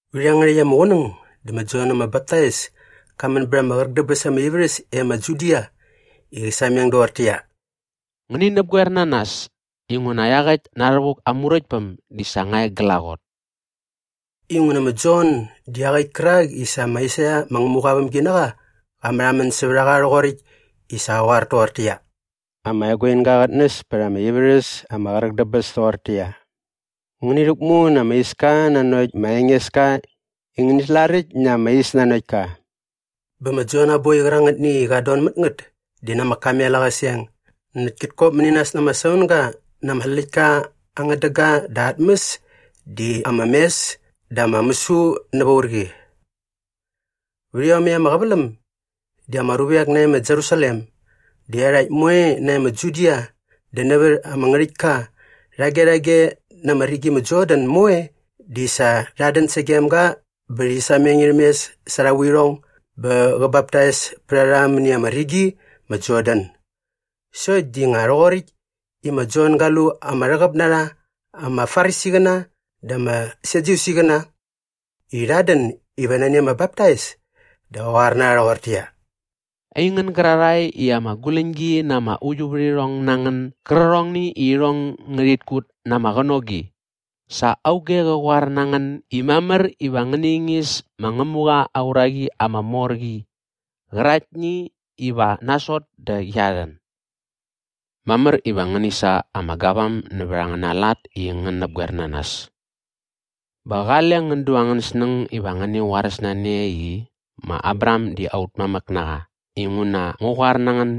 Vät iangärhäkt ama qunäng dä ma Jon ama Baptais ka män bät ama qräk dä bäs ama ivärhäs e ma Judia i qä sameng doqortäqyia, “Ngäni näpgoer na nas inguna iaqäkt na rhävuk aa Muräktpäm di sa nga e glaqot.” Inguna ma Jon di iaqäkt kärak i sa ma Aisaia ma Ngämuqa aa vämginaqa qa märhamän sävät a qa rhoqoräkt i sa qa qoar toqortäqyia, “Ama eguinga qät näs pät ama ivärhäs ama qräk dä bäs toqortäqyia, ‘Ngäni rhäkmu na ama iska nanokt ma Engeska i ngäni slaräkt na ama is nanokt ka.’” Bä ma Jon aa boi qärangätni i qat don mät ngät di na ama kamel aa qäseng näkt kät kop mäni nas na ama saunga na ama släktka aa ngädäga dä aa tmäs di ama mes dä ama mäsu näva urqi. Vät iomäkt ama qäväläm di ama ruvek nae ma Jerusalem dä iarhakt moe nae ma Judia dä nävät ama ngärhäktka rhage rhage na ama rigi ma Jordan moe di sa rhat dän sagem ga bä rhi sameng irhäm mes sa arha vuirhong bä qä baptais pät a rha mäni ama rigi ma Jordan. Sokt di nga rhoqoräkt i ma Jon ga lu ama rhäqäp na rha ama Farisiqäna dä ama Sadyusiqäna i rhat dän iva nani ama baptais dä qa qoar na rha rhoqortäqyia, “Aingän gärarhae i ama guläñgi na ama uiuvärhirhong na ngän gärqärhongni i irhong ngärhit kut na ama qänogi, sa auge qa qoar na ngän i mamär iva ngäni ingis ma Ngämuqa aa uraqi ama mor qi qäraktni iva nasot dä qia rhän? Mamär iva ngäni sa ama gavam nävät angäna lat i ngän näpgoer na nas. Bä qale ngän du angän snäng iva ngäni qoaräs na ne i, ‘Ma Abraham di aut mamäk na qa’ inguna ngu qoar na ngän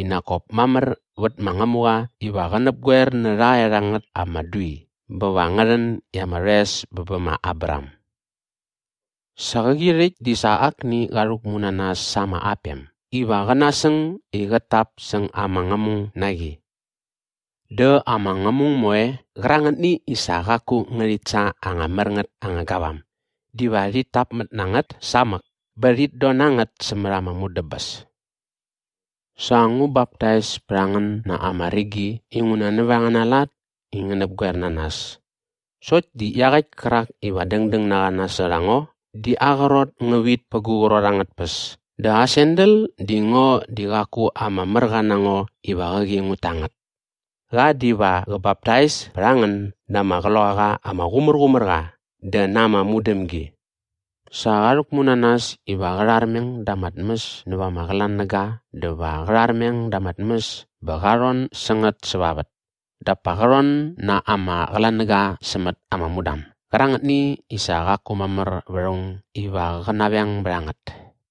i nak kop mamär vät ma Ngämuqa iva qä näpgoer nä rhaerhangät ama dui bä va ngä rhän i ama rhoes bä bä ma Abraham. Sa qäqi rhäkt di sa akni qa rhäkmu na nas sa ama apem iva qä nasäng i qät tap säng ama ngämung na qi. Dä ama ngämung moe qärangätni i sa qaku ngärhit sa anga mär ngät anga gavam diva rhit täpmät na ngät samäk bä rhit don na ngät sämät ama mudäbäs. “Sa ngu baptais pät a ngän na ama rigi inguna nävät angäna lat i ngän näpgoer na nas sokt di iaqäkt kärak iva dängdäng na qa nasot a ngo di aa qrot ngä vit pät gu qrot angät tpäs dä aa sandal di ngo di qaku ama märqa na ngo iva qäqi ngut ta ngät. Qa diva qä baptais pät a ngän na ama Qloqaqa ama Qumärqumärqa dä na ama mudämgi. Sa qa rhäkmu na nas iva qä rharmeng da ama tmäs näva ama qlanäga dä va qä rharmeng da ama tmäs bä qa rhon sä ngät säva vät dap pa qä rhon na ama qlanäga sämät ama mudam gärangätni i sa qaku mamär vät aung iva qä naveng bät a ngät.”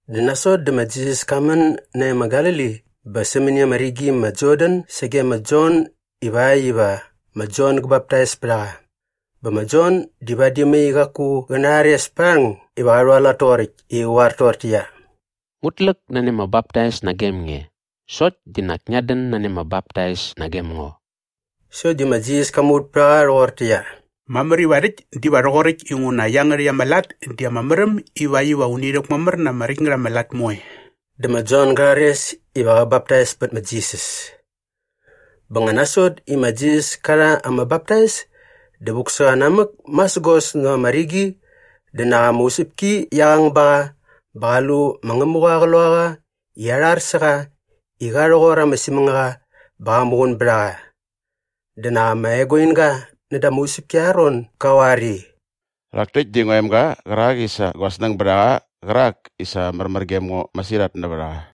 Dä nasot dä ma Jisas ka män nae ma Galili bä sämäni ama rigi ma Jordan sage ma Jon ivakt iva ma Jon gä baptais pät a qa. Bä ma Jon di vadi mai qaku qä narhares pät aa rhäng iva qa rhualat toqoräkt i qä qoar toqortäqyia, “Ngut läk nani ama baptais nagem nge sokt di nak ngiat dän nani ama baptais nagem ngo.” Sokt di ma Jisas ka muvät pät a qa rhoqortäqyia, “Mamär iva rhäkt diva rhoqoräkt inguna iangärhäkt ama lat di ama märäm ivakt iva uni rhäkmamär na ama räkt ngät ama lat moe.” Dä ma Jon ga rhares iva qä baptais pät ma Jisas. Bä nga nasot i ma Jisas ka rha ama baptais dä vuk sä qa namäk masägos näva ama rigi dä nak ama usäpki qia qang ba qa bä qa lu ma Ngämuqa aa Qloqaqa i arhar sä qa i qa rhoqor ama simängaqa bä qa muqun bät a qa. Dä nak ama eguinga näda ama usäpki arha ron ga qoar i, “Rhak täkt di ngua emga qärak i sa gua snäng bät a qa qärak i sa märmär gem ngo masirhat nävät a qa.”